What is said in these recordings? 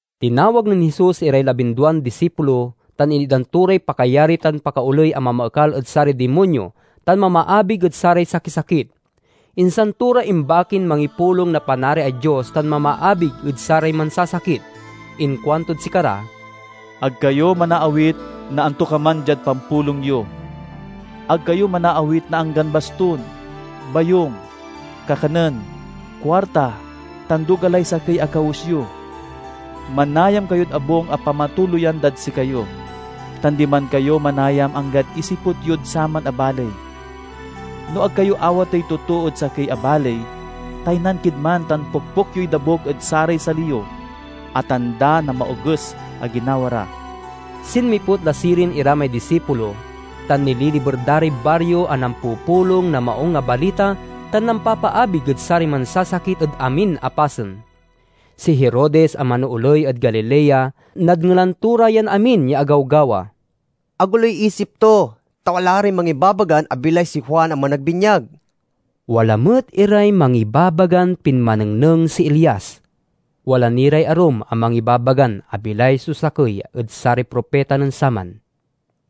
Tinawag nen Jesus iray labinduan disipulo tan initdan to ray pakayari tan pakaoley a mamaekal ed saray dimonyo tan mamaabig ed saray sakisakit. Insan to ra imbakin mangipulong na Panariay Dios tan mamaabig ed saray mansasakit. Inkuantod sikara, "Ag kayo manaawit na antokaman diad pampulong yo. Ag kayo manaawit na anggan bastun, bayung, kakanen, kuarta, tan duga lay sakey a kawes yo. Manayam kayod abung a pamatuloyan dad sikayo, tan diman kayo manayam anggad isiput yod saman a baley. No ag kayo awatey totoo ed sakey a baley, taynan kid man tan pokpok yoy dabuk ed saray sali yo, a tanda na maoges a ginawa ra." Sinmiput la sirin ira may disipulo, tan nililiber da ray bario a nampupulong na Maung a Balita tan nampapaabig ed saray mansasakit ed amin a pasen. Si Herodes a manooley ed Galilea nadngelan to ra yan amin ya agawgawa. Agoloy isip to, ta wala ray mangibabagan abilay si Juan a Managbinyag. Wala met iray mangibabagan pinmanengneng si Elias. Wala ni ray arum a mangibabagan abilay so sakey ed saray propita nen saman.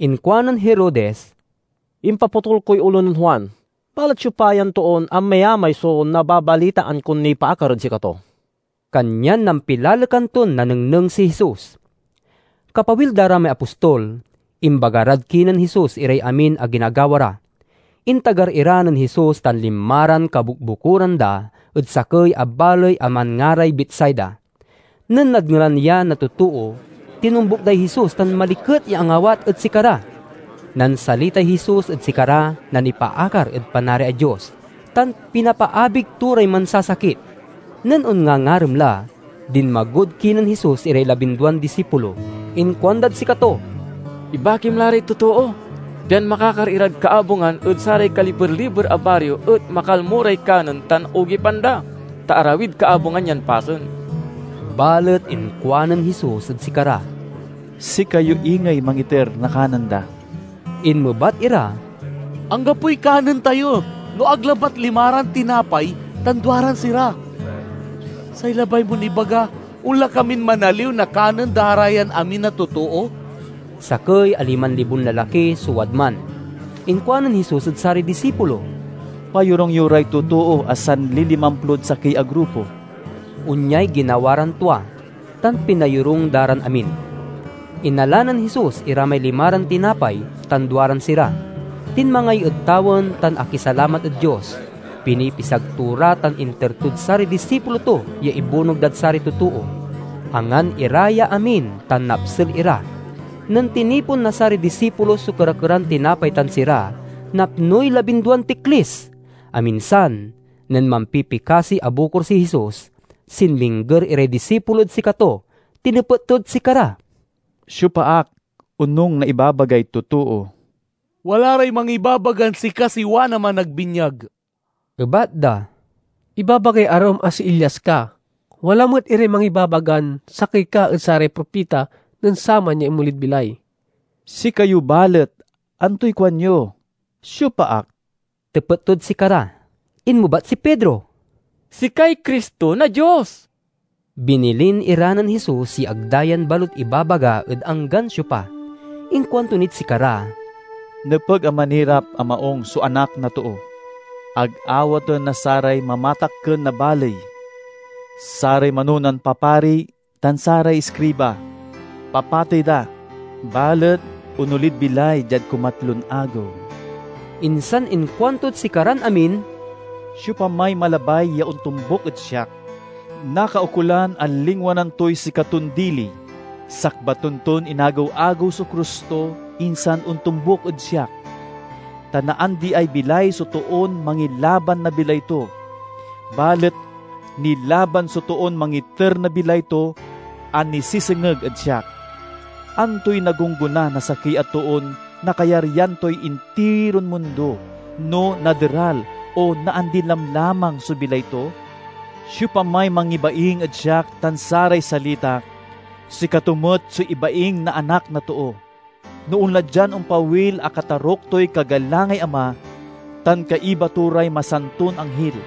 Inkuanen Herodes, "Impapotul koy olo nen Juan. Balet siopa yan toon amayamay so nababalitaan kon nipaakar ed sikato?" Kanyan nampilalekan ton nanengneng si Jesus. Kapawil da ra may apostol, imbaga rad kinen Jesus iray amin a ginagawa ra. Intagar ira nen Jesus tan linma ran kabukbukoran da ed sakey a baley a manngaray Betsaida. Nen nadngelan ya na totoo, tinombuk day Jesus tan maliket ya angawat ed sikara. Nansalitay Jesus ed sikara na nipaakar ed Panariay Dios, tan pinapaabig to ray mansasakit. Nen onngangarem la, dinmagod kinen Jesus iray labinduan disipulo. Inkuandad sikato, "Ibakim la ray totoo, pian makakar irad kaabungan ed saray kaliber-liber a bario, et makalmo ray kanen tan ogipan da, ta arawid kaabungan yan pasen." Balet inkuanen Jesus ed sikara, "Sikayo ingey mangiter na kanen da." Inmebat ira, "Anggapoy kanen tayo no ag labat limaran tinapay tan duaran sira. Say labay mon ibaga, onla kamin manaliw na kanen da ra yan amin a totoo?" (Sakey a liman libon lalaki so wadman.) Inkuanen Jesus ed saray disipulo, "Payorung yo ray totoo a sanlilimamplod sakey a grupo." Onyay ginawa ran tua, tan pinayorung da ran amin. Inala nen Jesus ira may limaran tinapay tan duaran sira, tinmangay ed tawen, tan akisalamat ed Dios. Pinipisag to ra tan inter tod saray disipulo to ya ibunog dad saray totoo. Angan ira ya amin tan napsel ira. Nen tinipon na saray disipulo so kera-keran tinapay tan sira, napnoy labinduan tiklis. Aminsan nen mampipikasi a bukor si Jesus, sinmingger iray disipulod sikato. Tinepet tod sikara, "Siopa ak, onung na ibabagay totoo?" "Wala ray mangibabagan sika si Juan a Managbinyag," ebat da. "Ibabagay arum a si Elias ka; wala met iray mangibabagan sakey ka ed saray propita nen saman ya inmolid bilay." "Sikayo balet, antoy kuanyo? Siopa ak?" tepet tod sikara. Inmebat si Pedro, "Sikay Cristo na Dios!" Binilin ira nen Jesus ya ag da yan balut ibabaga ed anggan siopa. Inkuanto nid sikara, "Nepeg a manirap a maung so Anak na Too. Ag awaten na saray mamatakken na baley, saray manonan papari, tan saray iskriba. Papatey da, balet onolid bilay diad kumatlon agew." Insan inkuantod sikaran amin, "Siopamay malabay ya ontombuk ed siak, nakaukolan a lingwanan toy sikaton dili, sakbaten ton inagew-agew so krus to, insan ontombuk ed siak. Ta naandiay bilay so toon mangilaban na bilay to; balet nilaban so toon mangiter na bilay to a nisesengeg ed siak. Antoy nagonggona na sakey a toon nakayaryan toy intiron mundo, no naderal o naandi lamlamang so bilay to? Siopamay mangibaing ed siak tan saray salitak, sikato met so ibaing na Anak na Too, no onla dian ompawil a kataruk toy kagalangay Ama, tan kaiba to ray masanton anghil.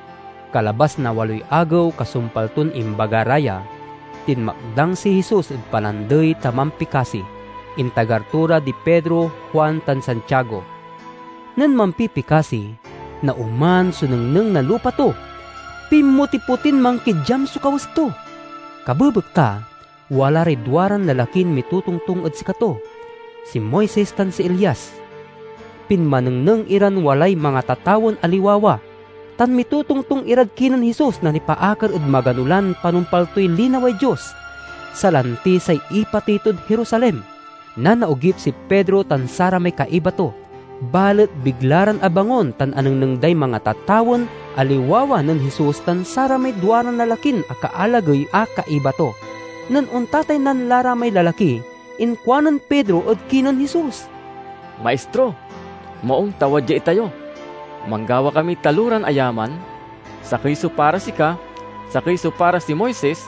Kalabas na waloy agew kasumpal ton imbaga ra ya, tinmakdang si Jesus ed palandey ta mampikasi. Intagar to ra di Pedro, Juan tan Santiago. Nen mampipikasi, naoman so nengneng na lupa to. Pinmotipotin mankidyam so kawes to. Kabebekta, wala ray duaran lalakin mitotongtong ed sikato: si Moises tan si Elias. Pinmanengneng iran walay mangatatawen a liwawa, tan mitotongtong irad kinen Jesus na nipaakar ed magano lan panumpal toy linaway Dios, salanti say ipatey tod Jerusalem. Nanaogip si Pedro tan saramay kaiba to, balet bigla ran abangon tan anengneng day mangatatawen a liwawa nen Jesus tan saramay duaran lalakin akaalagey a kaiba to. Nen ontataynan la ra may lalaki, inkuanen Pedro ed kinen Jesus, "Maistro, maung ta wadya itayo. Manggawa kamiy taloran ayaman: sakey so para sika, sakey so para si Moises,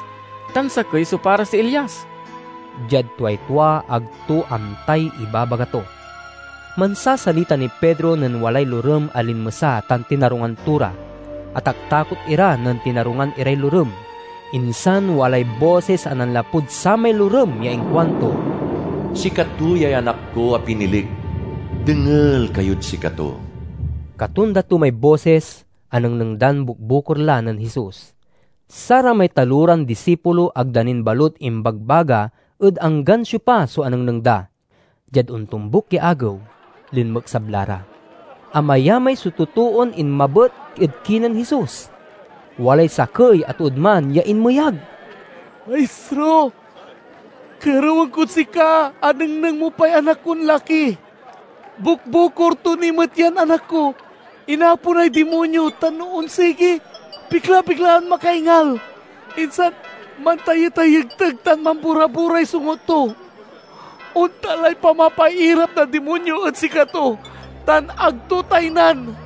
tan sakey so para si Elias." (Diad tuay tua ag to amtay ibabaga to.) Mansasalita niy Pedro nen walay lorem a linmesa tan tinarungan to ra. Ataktakot ira nen tinarungan iray lorem. Insan walay bosis a nanlapud samay lorem ya inkuanto, "Sikato yay Anak ko a pinilik. Dengel kayod sikato!" Katonda to may bosis, anengneng dan bukbukor la nen Jesus. Saramay taloran disipulo ag da nin balut imbagbaga ed anggan siopa so anengneng da. Diad ontombuk ya agew, linmeksab la ra. Amayamay so totoon inmabet ed kinen Jesus. Walay sakey a tood man ya inmeyag, "Maistro! Kerewen kod sika a nengneng mo pay anak konlaki. Bukbukor to ni met yan anak ko! Inaponay dimonyo tan no onsigi, bigla-biglan makaingal, insan mantayetayegteg tan mambora-boray songut to. Ontan lay pamapairap na dimonyo ed sikato tan ag to taynan!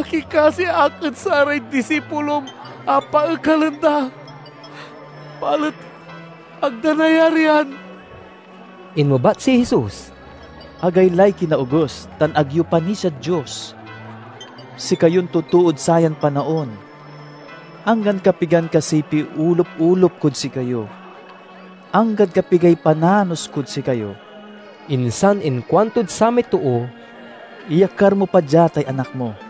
Akikasi ak ed saray disipulom a paekalen da, balet ag da nayarian." Inmebat si Jesus, "Agaylay kinaoges tan ag yo panisiad Dios, sikayon totood sayan panaon! Anggan kapigan kasiy piolup-olup kod sikayo? Anggad kapigay pananos kod sikayo?" Insan inkuantod samay too, "Iyakar mo pa dia tay anak mo."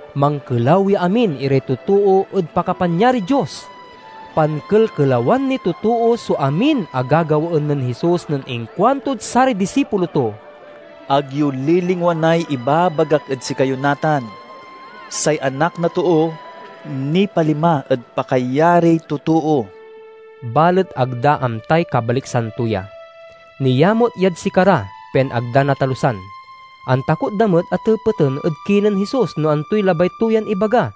Mankelaw ya amin iray totoo ed pakapanyariy Dios. Pankelkelawan niy totoo so amin a gagawaen nen Jesus nen inkuantod saray disipulo to, "Ag yo lilingwanay ibagak ed sikayo natan! Say Anak na Too nipalima ed pakayariy totoo." Balet ag da amtay kabaliksan to ya. Niamut yad sikara, pian ag da natalusan. Antakot da met a tepeten ed kinen Jesus no antoy labay to yan ibaga.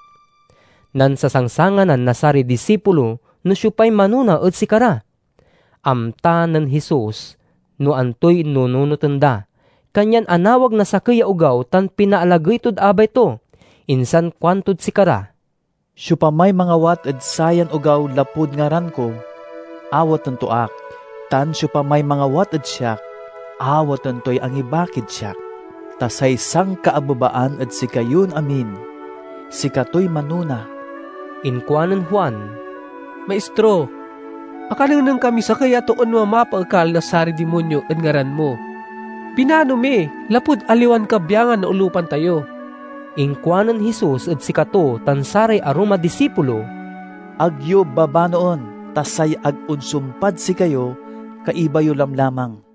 Nansasangsanganan na saray disipulo no siopay manona ed sikara. Amta nen Jesus no antoy nununoten da, kanyan anawag na sakey ya ogaw tan pinaalagey tod abay to. Insan kuantod sikara, "Siopamay mangawat ed sayan ogaw lapud ngaran ko, awaten to ak; tan siopamay mangawat ed siak, awaten toy angibakid siak. Ta say sankaabebaan ed sikayon amin, sikatoy manona." Inkuanen Juan, "Maistro, akanengneng kamiy sakey a toon mamapaekal na saray dimonyo ed ngaran mo. Binano mi, lapud aliwan kabyangan na olupan tayo." Inkuanen Jesus ed sikato tan saray arum a disipulo, "Ag yo babanoen, ta say ag onsumpad sikayo, kaiba yo lamlamang."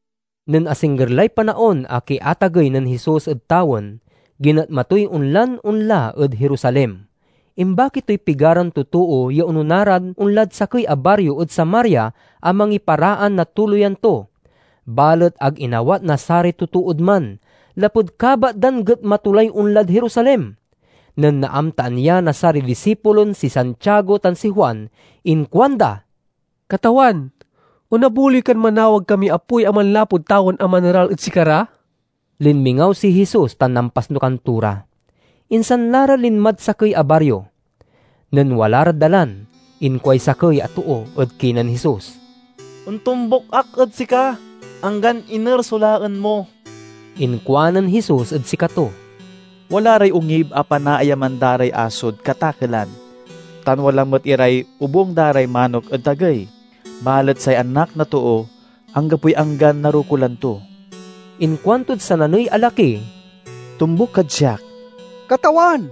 Nen asingger lay panaon a kiatagey nen Jesus ed tawen, ginetma toy onlan onla ed Jerusalem. Imbaki toy pigaran totoo ya onona ran onlad sakey a bario ed Samaria a mangiparaan na tuloyan to. Balet ag inawat na saray totood man, lapud kabat dan getma to lay onlad Jerusalem. Nen naamtaan ya na saray disipulon si Santiago tan si Juan, inkuanda, "Katawan, onabuloy kan manawag kamiy apoy a manlapud tawen a maneral ed sikara?" Linmingaw si Jesus tan nampasnukan to ra; insan la ra linmad sakey a bario. Nen wala rad dalan, inkuay sakey a too ed kinen Jesus, "Ontombuk ak ed sika, anggan iner so laen mo." Inkuanen Jesus ed sikato, "Wala ray ongib a panaayaman da ray asod katakelan, tan wala met iray obung da ray manok ed tagey, balet say Anak na Too anggapoy anggan narokulan to." Inkuantod sananey a laki, "Tombuk kad siak." "Katawan,"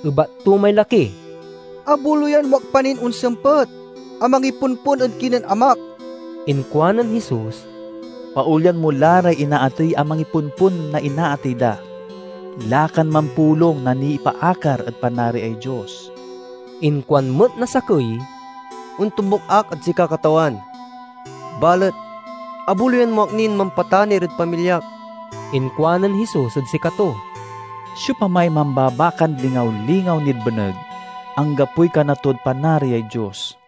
ebat to may laki, "abuloyan mo ak pa nin onsempet a mangipompon ed kinen amak." Inkuanen Jesus, "Paolyan mo la ray inaatey a mangipompon na inaatey da. Lakan mampulong na nipaakar ed Panariay Dios." Inkuan met na sakey, "Ontombuk ak ed sika, Katawan, balet abuloyan mo ak nin mampatanir ed pamilyak." Inkuanen Jesus ed sikato, "Siopamay mambabakan lingaw-lingaw nid beneg, anggapoy kana tod Panariay Dios."